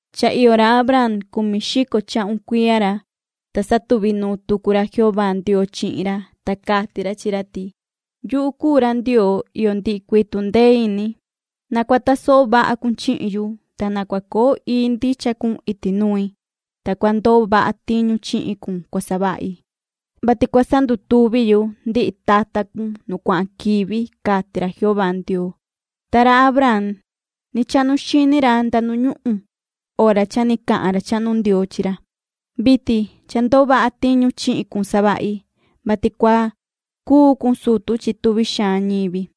Cha iyo ra Abraam cumi xico chahun cuiya ra, ta satuvi nuun tucu ra Jehová Ndioo chihin ra, ta cati ra chi ra ti: ―Yuhu cuu ra Ndioo iyo ndihi cuii tundee ini. Na cua tasoho vaha cun chihin yu, ta na cua coo ii ndicha cun iti nui. Ta cua ndoo vaha tiñu chihin cun cua savahi, vati cua sandutuvi yu ndihi tata cun nu cuahan quivi ―cati ra Jehová Ndioo. Ta ra Abraam ni chahnu xini ra nda nu ñuhun hora cha ni cahan ra chahnu Ndioo chi ra: ―Vitin cha ndoo vaha tiñu chihin cun savahi, vati cua cuu cun sutu chi tuvi xaan ñivi.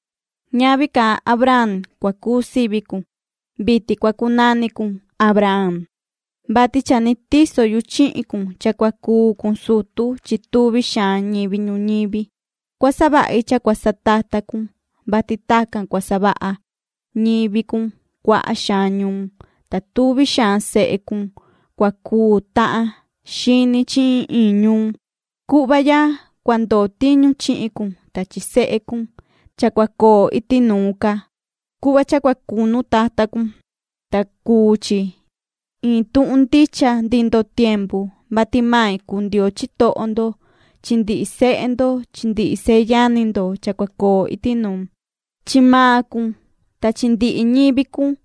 Ñavi ca Abraam cua cuu sivi cun. Vitin cua cunani cun Abraham, vati cha ni tiso yu chihin cun cha cua cuu cun sutu chi tuvi xaan ñivi ñuñivi. Cua savahi cha cua satata cun, vati tacan cua savaha ñivi cun cuaha xaan ñuun, ta tuvi xaan sehe cun cua cuu tahan xini chi iin iin ñuun. Cuhva ya cua ndoo tiñu chihin cun ta chi sehe cun cha cua coo iti nuun ca, cuhva cha cua cunu tata cun, ta cuu chi iin tuhun ndicha ndihi ndoo tiempu, main cua cuu Ndioo cun, ta suvi ni main cua cuu Ndioo ndihi sehe cun chi ndihi seyani cun cha cua coo iti nuun. Chi maan cun ta chi ndihi ñivi cun,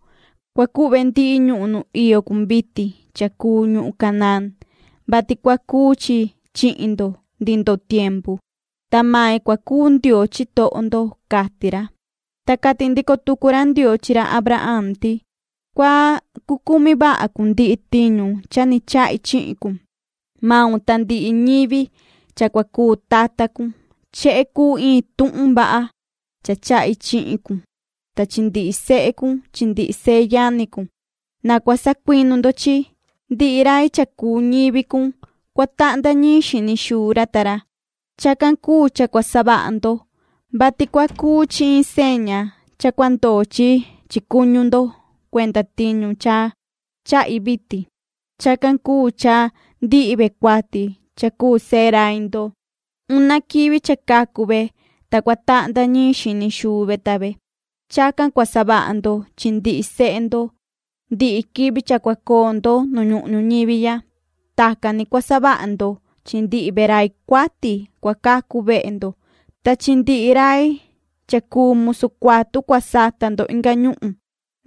cua cuhve ndihi ñuhun nu iyo cun vitin cha cuu ñuhun Canaán, vati cua cuu chi chihin ndo ndihi ndoo tiempu, ta main cua cuu Ndioo ndo ―cati ra. Ta cati ndico tucu ra Ndioo chi ra Abraham ti: ―Cua cucumi vaha cun ndihi tiñu cha ni chahi chihin cun, maun ta ndihi ñivi cha cua cuu tata cun. Chehe cuu iin tuhun vaha cha chahi chihin cun ta chi ndihi sehe cun chi ndihi seyani cun. Na cua sacuinu ndo chi, ndihi rai cha cuu ñivi cun cua tahnda ñiin xini xuu ra ta ra. Chacan cuu cha cua savaha ndo, vati cua cuu chi iin seña cha cua ndoo chi chi cuñu ndo cuenda tiñu cha chahi vitin. Chacan cuu cha ndihi ve cuati cha cuu sehe rai ndo, una quivi cha cacu ve ta cua tahnda ñiin xini xuu ve ta ve. Chacan cua savaha ndo chi ndihi sehe ndo ndihi quivi cha cua coo ndo nu ñuhun ñuñivi ya. Tacan ni cua savaha ndo chi ndihi ve rai cuati cua cacu vehe ndo ta chi ndihi rai cha cuu musu cuatu cua sata ndo inga ñuhun,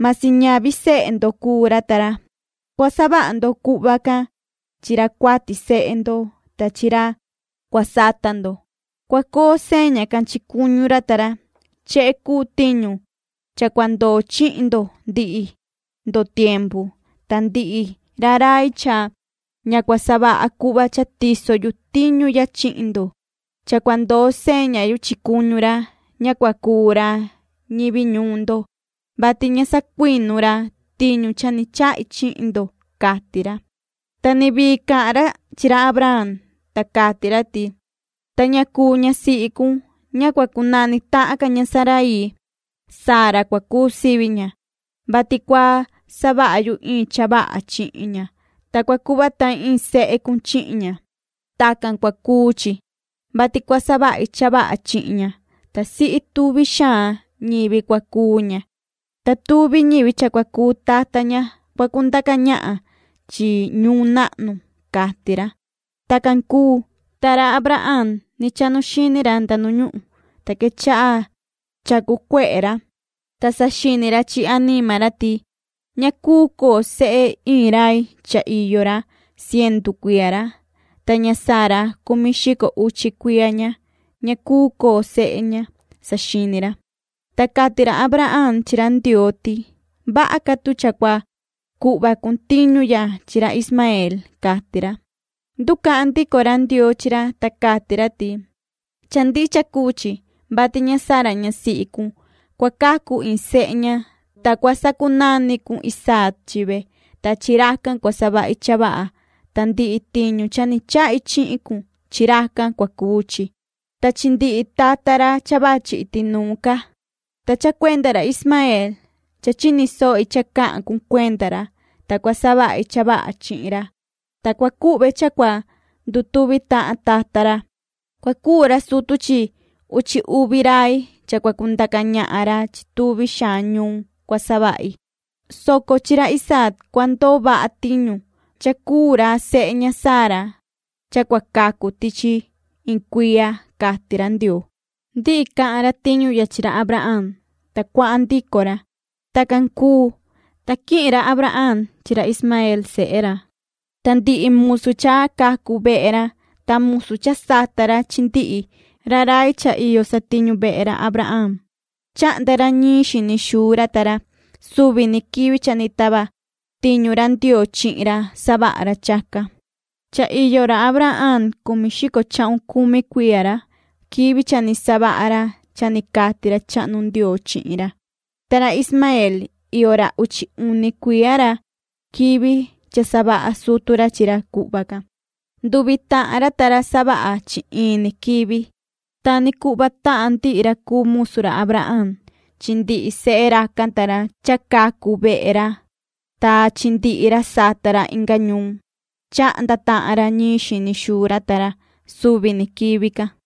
masi ñavi sehe ndo cuu ra ta ra. Cua savaha ndo cuhva can chi ra cuati sehe ndo ta chi ra cua sata ndo. Cua coo seña can chi cuñu ra ta ra. Chehe cuu tiñu cha cua ndoo chihin ndo ndihi ndoo tiempu. Ta ndihi ra rai cha ña cua savaha cuhva cha tiso yu tiñu ya chihin ndo, cha cua ndoo seña yu chi cuñu ra, cua sacunu ndo chi ra, ta ña cua cuu ca ra ñivi ndo, vati ña sacuinu ra tiñu cha ni chahi chihin ndo ―cati ra. Ta ni vii cahan ra chi ra Abraham, ta cati ra ti: ―Ta ña cuu ñasihi cun, ña cua cunani tahan ca ña Saraii, Sara cua cuu sivi ña, vati cua savaha yu iin cha vaha chihin ña, ta cua cuhva tahin iin sehe cun chihin ña. Tacan cua cuu chi, vati cua savahi cha vaha chihin ña, ta sihi tuvi xaan ñivi cua cuu ña, ta tuvi ñivi cha cua cuu tata ña cua cundaca ñahan chi ñuun nahnu ―cati ra. Tacan cuu, ta ra Abraham ni chahnu xini ra nda nu ñuhun, ta quechaha chacu cuehe ra, ta saxini ra chi anima ra ti: “Ña cuu coo sehe iin rai cha iyo ra cientu cuiya ra, ta ña Sara cumi xico uchi cuiya ña, ña cuu coo sehe ña”, saxini ra. Ta cati ra Abraham chi ra Ndioo ti: ―Vaha ca tu cha cua cuhva cun tiñu ya chi ra Ismaeel ―cati ra. Nducahan ndico ra Ndioo chi ra, ta cati ra ti: ―Cha ndicha cuu chi, vati ña Sara ñasihi cun, cua cacu iin sehe ña, ta cua sacunani cun Isaac chi ve, ta chi racan cua savahi cha vaha, ta ndihi tiñu cha ni chahi chihin cun, chi racan cua cuu chi, ta chi ndihi tata ra cha vachi iti nuun ca. Ta cha cuenda ra Ismaeel cha chini sohi cha cahan cun cuenda ra. Ta cua savahi cha vaha chihin ra, ta cua cuhve cha cua ndutuvi tahan tata ra. Cua cuu ra sutu chi uchi uvi rai cha cua cundaca ñahan ra chi tuvi xaan ñuun cua savahi, soco chi ra Isaac cua ndoo vaha tiñu, cha cuu ra sehe ña Sara cha cua cacu tichi iin cuiya ―cati ra Ndioo. Ndihi cahan ra tiñu ya chi ra Abraham, ta cuahan ndico ra. Tacan cuu, ta quihin ra Abraham chi ra Ismaeel sehe ra, ta ndihi musu cha cacu vehe ra ta musu cha sata ra chi ndihi ra rai cha iyo satiñu vehe ra Abraham chahnda ra ñiin xini xuu ra ta ra. Suvi ni quivi cha ni tava tiñu ra Ndioo chihin ra savaha ra chacan. Cha iyo ra Abraham cumi xico chahun cumi cuiya ra quivi cha ni savaha ra cha ni cati ra chahnu Ndioo chihin ra. Ta ra Ismaeel iyo ra uchi uni cuiya ra quivi cha savaha sutu ra chi ra cuhva can. Nduvi tahan ra ta ra savaha chi in ni quivi. Ta ni cuhva tahan ndihi ra cuu musu ra Abraham chi ndihi sehe racan ta ra cha cacu vehe ra ta chi ndihi ra sata ra inga ñuun, chahnda tahan ra ñiin xini xuu ra ta ra suvi ni quivi can.